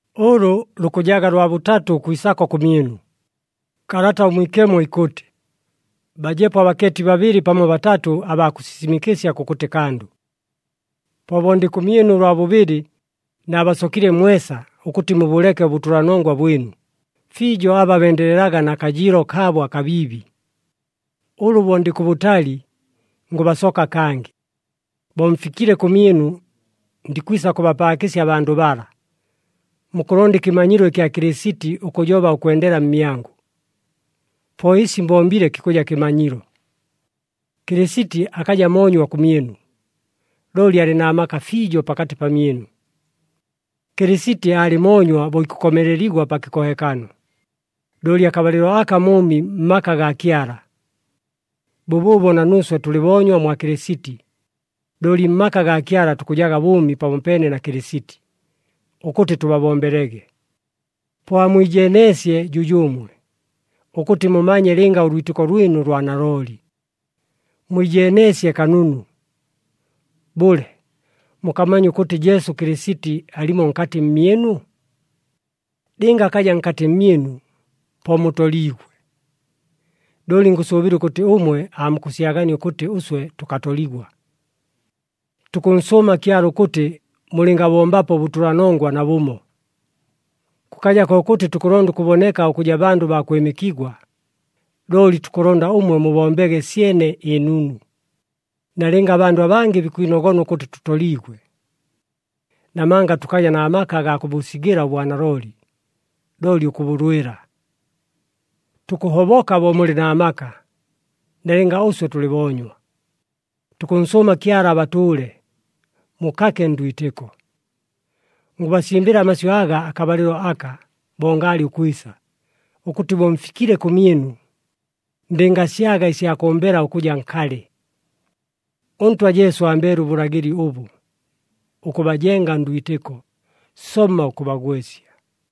Ʉlʉ lukʉjaga lwa bʉtatʉ ʉkwisako kʉmyɨnu. Kalata ʉMwikemo ikʉtɨ, “Bajepo abakeeti babɨlɨ pamo batatʉ abaa kʉsisimɨkɨsya kʉkʉtɨ kandʉ.” Po bo ndɨ kʉmyɨnu ʉlwa bʉbɨlɨ, naabasokile mwesa, ʉkʉtɨ mubʉleke ʉbʉtʉlanongwa bwɨnu, fiijo aba bendelelaga na kajɨɨlo kaabo akabiibi. Ʉlʉ bo ndɨ kʉbʉtali, ngʉbasoka kangɨ. Bo mfikile kʉmyɨnu, ndikwisa kʉbapaakɨsya abandʉ bala. Mukʉlonda ɨkɨmanyilo ɨkya Kɨlɨsiti ʉkʉjoba ʉkwendela mmyangʉ. Po ɨsi mbombile kikʉja kɨmanyilo. Kɨlɨsiti akaja moonywa kʉmyɨnu, looli alɨ na maka fiijo pakatɨ pamyɨnu. Kɨlɨsiti aalɨ moonywa bo ikʉkomeleligwa pa kɨkohekano, looli akabalɨlo aka mʉʉmi mmaka gaa Kyala. Bʉbʉʉbo na nuuswe tʉlɨ boonywa mwa Kɨlɨsiti, looli mmaka gaa Kyala tukʉjaga bʉʉmi pamopeene na Kɨlɨsiti, ʉkʉtɨ tʉbabombelege. Po amwijeeneesye jʉjʉʉmwe, ʉkʉtɨ mumanye lɨnga ʉlwitɨko lwɨnu lwa nalooli. Mwijeeneesye kanunu. Bʉle, mukamanya ʉkʉtɨ Jesu Kɨlɨsiti alimo nkatɨ mmyɨnu? Lɨnga akaja nkatɨ mmyɨnu, po mutoliigwe. Looli ngʉsʉʉbɨla ʉkʉtɨ ʉmwe aamukʉsyagania ʉkʉtɨ ʉswe tʉkatoligwa. Tukʉnsʉʉma Kyala ʉkʉtɨ mulɨngabombapo ʉbʉtʉlanongwa nabʉmo. Kʉkaja kokʉtɨ tukʉlonda ʉkʉboneka ʉkʉja bandʉ baa kwɨmɨkigwa, looli tukʉlonda ʉmwe mubombege syene ɨnunu, nalɨnga abandʉ abangɨ bikwinogona ʉkʉtɨ tʉtoliigwe. Namanga tʉkaja na maka agaa kʉbʉsigɨla ʉbwanalooli, looli ʉkʉbʉlwɨla. Tukʉhoboka bo mulɨ na maka, nalɨnga ʉswe tʉlɨ boonywa. Tukʉnsʉʉma Kyala abatʉʉle, mukake ndwitɨko. Ngʉbasimbɨla amasyʉ aga akabalɨlo aka, bo ngaalɨ ʉkwisa, ʉkʉtɨ bo mfikile kʉmyɨnu, ndɨngasyaga ɨsya kʉmbela ʉkʉja nkalɨ. ɄNtwa Jesu ambeele ʉbʉlagɨli ʉbʉ, ʉkʉbajenga ndwitɨko, somma ʉkʉbagwɨsya.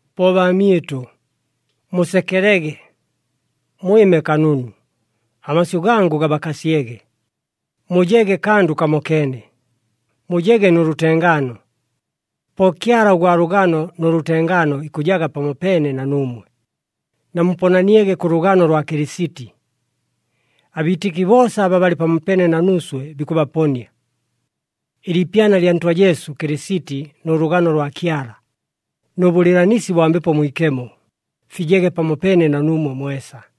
Po baamyɨtʉ, musekelege. Mwɨme kanunu, amasyʉ gangʉ gabakasyege, mujege kandʉ kamokeene, mujege nʉ lʉtengaano. Po Kyala ʉgwa lʉgano nʉ lʉtengaano ikʉjaga pamopeene na nuumwe. Namuponaniege kʉ lʉgano lwa Kɨlɨsiti. Abiitɨki boosa aba balɨ pamopeene na nuuswe, bikʉbaponia. Ɨliipyana lya Ntwa Jesu Kɨlɨsiti nʉ lʉgano lwa Kyala, nʉ bʉlɨɨlanisi bwa Mbepo Mwikemo, fijege pamopeene na nuumwe mwesa.